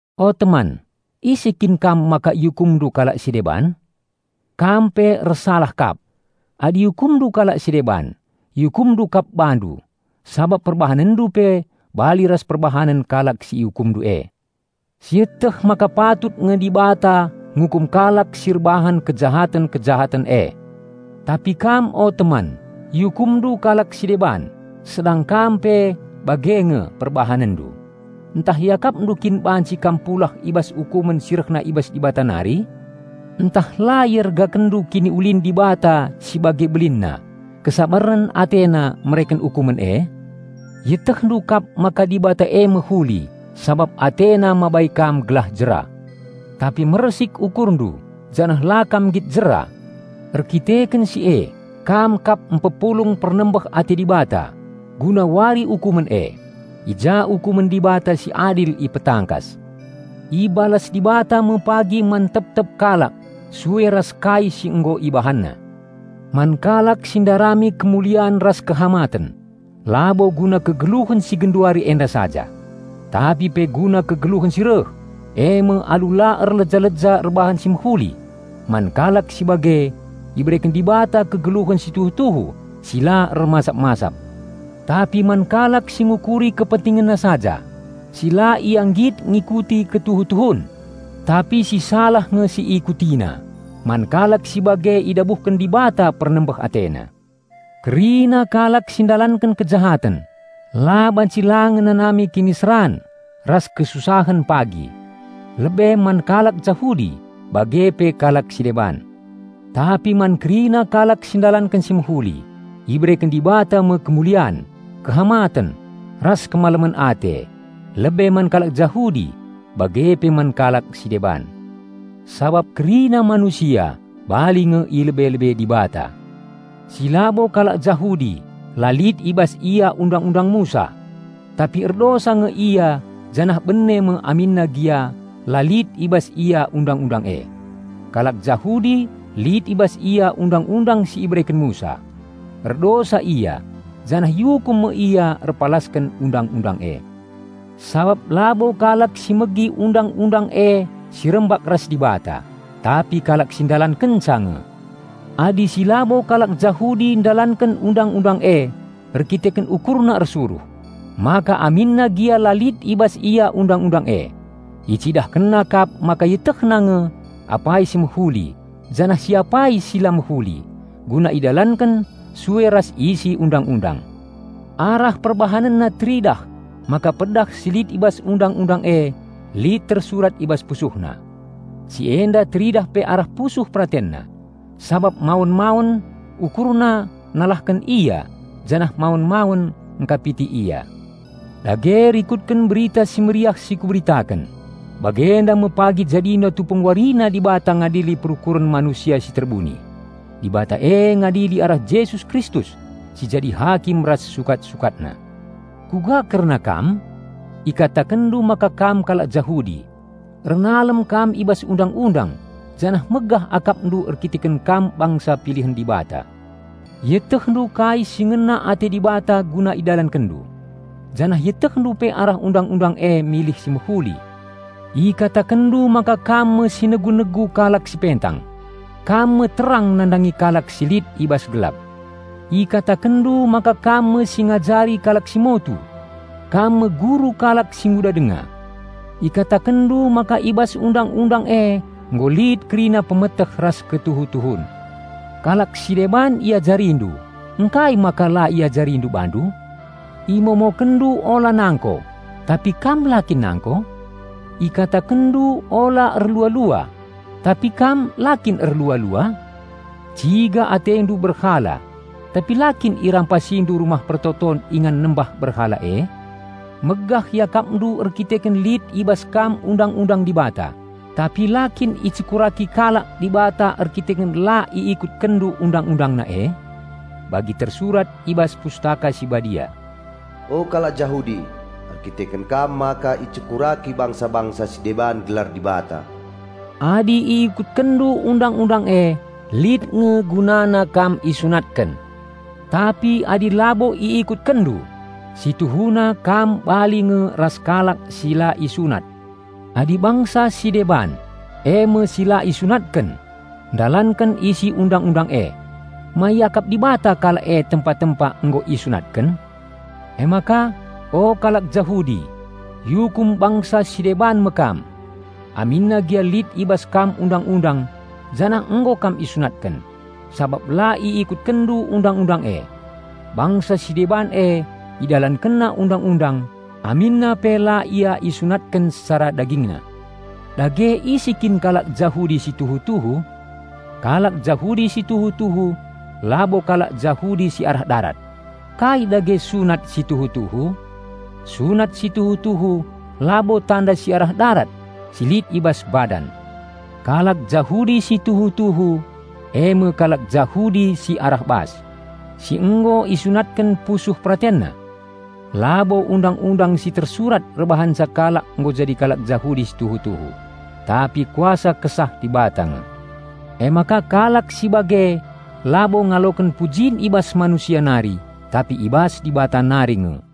O teman, ise kin kam maka iukumndu kalak si deban? Kam pe ersalah kap! Adi iukumndu kalak si deban, iukumndu kap bandu, sabap perbahanenndu pe bali ras perbahanen kalak si iukumndu e. Sieteh maka patut nge Dibata ngukum kalak si erbahan kejahaten-kejahaten e. Tapi kam o teman, iukumndu kalak si deban, sedang kam pe bage nge perbahanenndu! Ntah iakapndu kin banci kam pulah i bas ukumen si rehna i bas Dibata nari? Ntah la iergakenndu kiniulin Dibata si bage belinna, kesabaren AteNa mereken ukumen e? Ietehndu kap maka Dibata e mehuli, sabap AteNa mabai kam gelah jera. Tapi mersik ukurndu janah la kam nggit jera. Erdandanken si e kam kap mpepulung pernembeh ate Dibata guna Wari Ukumen e, i ja ukumen Dibata si adil ipetangkas. Ibalas Dibata me pagi man tep-tep kalak sue ras kai si nggo ibahanna. Man kalak si ndarami kemulian ras kehamaten, labo guna kegeluhen si genduari enda saja, tapi pe guna kegeluhen si reh, eme alu la erleja-leja erbahan si mehuli, man kalak si bage ibereken Dibata kegeluhen si tuhu-tuhu si la ermasap-masap. Tapi man kalak si ngukuri kepentingenna saja, si la ia nggit ngikuti ketuhu-tuhun, tapi si salah nge si iikutina, man kalak si bage idabuhken Dibata pernembeh AteNa. Kerina kalak si ndalanken kejahaten la banci la ngenanami kiniseran ras kesusahen pagi, lebe man kalak Jahudi bage pe kalak si deban. Tapi man kerina kalak si ndalanken si mehuli, ibereken Dibata me kemulian, kehamaten, ras kemalemen ate, lebe man kalak Jahudi, bage pe man kalak si deban. Sabap kerina manusia bali nge i lebe-lebe Dibata. Si labo kalak Jahudi la lit i bas ia Undang-undang Musa; tapi erdosa nge ia janah bene me aminna gia la lit i bas ia Undang-undang e. Kalak Jahudi lit i bas ia Undang-undang si ibereken Musa; erdosa ia janah iukum me ia erpalasken Undang-undang e. Sabap labo kalak si megi Undang-undang e si rembak ras Dibata, tapi kalak si ndalankenca nge. Adi si labo kalak Jahudi ndalanken Undang-undang e erdandanken ukurna ersuruh, maka aminna gia la lit i bas ia Undang-undang e, icidahkenna kap maka ietehna nge apai si mehuli janah si apai si la mehuli guna idalanken sue ras isi Undang-undang. Arah perbahanenna teridah maka pedah si lit i bas Undang-undang e lit tersurat i bas pusuhna. Si enda teridah pe arah pusuh peratenna, sabap mawen-mawen ukurna nalahken ia janah mawen-mawen engkapiti ia. Dage rikutken Berita Si Mehuli si kuberitaken, bagenda me pagi jadina tupung warina Dibata ngadili perukuren manusia si terbuni. Dibata e ngadili arah Jesus Kristus si jadi hakim ras sukat-sukatna. Kuga kerna kam? Ikatakenndu maka kam kalak Jahudi. Ernalem kam i bas Undang-undang janah megah akapndu erkiteken kam bangsa pilihen Dibata. Ietehndu kai si ngena ate Dibata guna idalankenndu. Janah ietehndu pe arah Undang-undang e milih si mehuli. Ikatakenndu maka kam me si negu-negu kalak si pentang, kam me terang nandangi kalak si lit i bas gelap. Ikatakenndu maka kam me si ngajari kalak si motu; kam me guru kalak si nguda denga. Ikatakenndu maka i bas Undang-undang e nggo lit kerina pemeteh ras ketuhu-tuhun. Kalak si deban iajarindu -- ngkai maka la iajarindu bandu? Imomokenndu "Ula nangko" -- tapi kam la kin nangko? Ikatakenndu "Ula erlua-lua" -- tapi kam la kin erlua-lua? Ciga atendu berhala -- tapi la kin irampasindu rumah pertoton ingan nembah berhala e? Megah iakapndu erdandanken lit i bas kam Undang-undang Dibata; tapi la kin icekuraki kalak Dibata erdandanken la iikutkenndu Undang-UndangNa e? Bagi tersurat i bas Pustaka Si Badia, "O kalak Jahudi, erdandanken kam maka icekuraki bangsa-bangsa si deban gelar Dibata." Adi iikutkenndu Undang-undang e lit nge gunana kam isunatken. Tapi adi labo iikutkenndu, si tuhuna kam bali nge ras kalak si la isunat. Adi bangsa si deban, eme si la isunatken, ndalanken isi Undang-undang e, ma iakap Dibata kalak e tempa-tempa nggo isunatken? Emaka, o kalak Jahudi, iukum bangsa si deban me kam, aminna gia lit i bas kam Undang-undang janah nggo kam isunatken, sabap la iikutkenndu Undang-undang e. Bangsa si deban e idalankenna Undang-undang aminna pe la ia isunatken secara dagingna. Dage ise kin kalak Jahudi si tuhu-tuhu? Kalak Jahudi si tuhu-tuhu labo kalak Jahudi si arah darat! Kai dage sunat tuhu-tuhu? Sunat si tuhu-tuhu labo tanda si arah darat si lit i bas badan! Kalak Jahudi si tuhu-tuhu eme kalak Jahudi si arah bas, si nggo isunatken pusuh peratenna. Labo Undang-undang si tersurat erbahanca kalak nggo jadi kalak Jahudi si tuhu-tuhu, tapi kuasa Kesah Dibata nge. Emaka kalak si bage labo ngaloken pujin i bas manusia nari tapi i bas Dibata nari nge.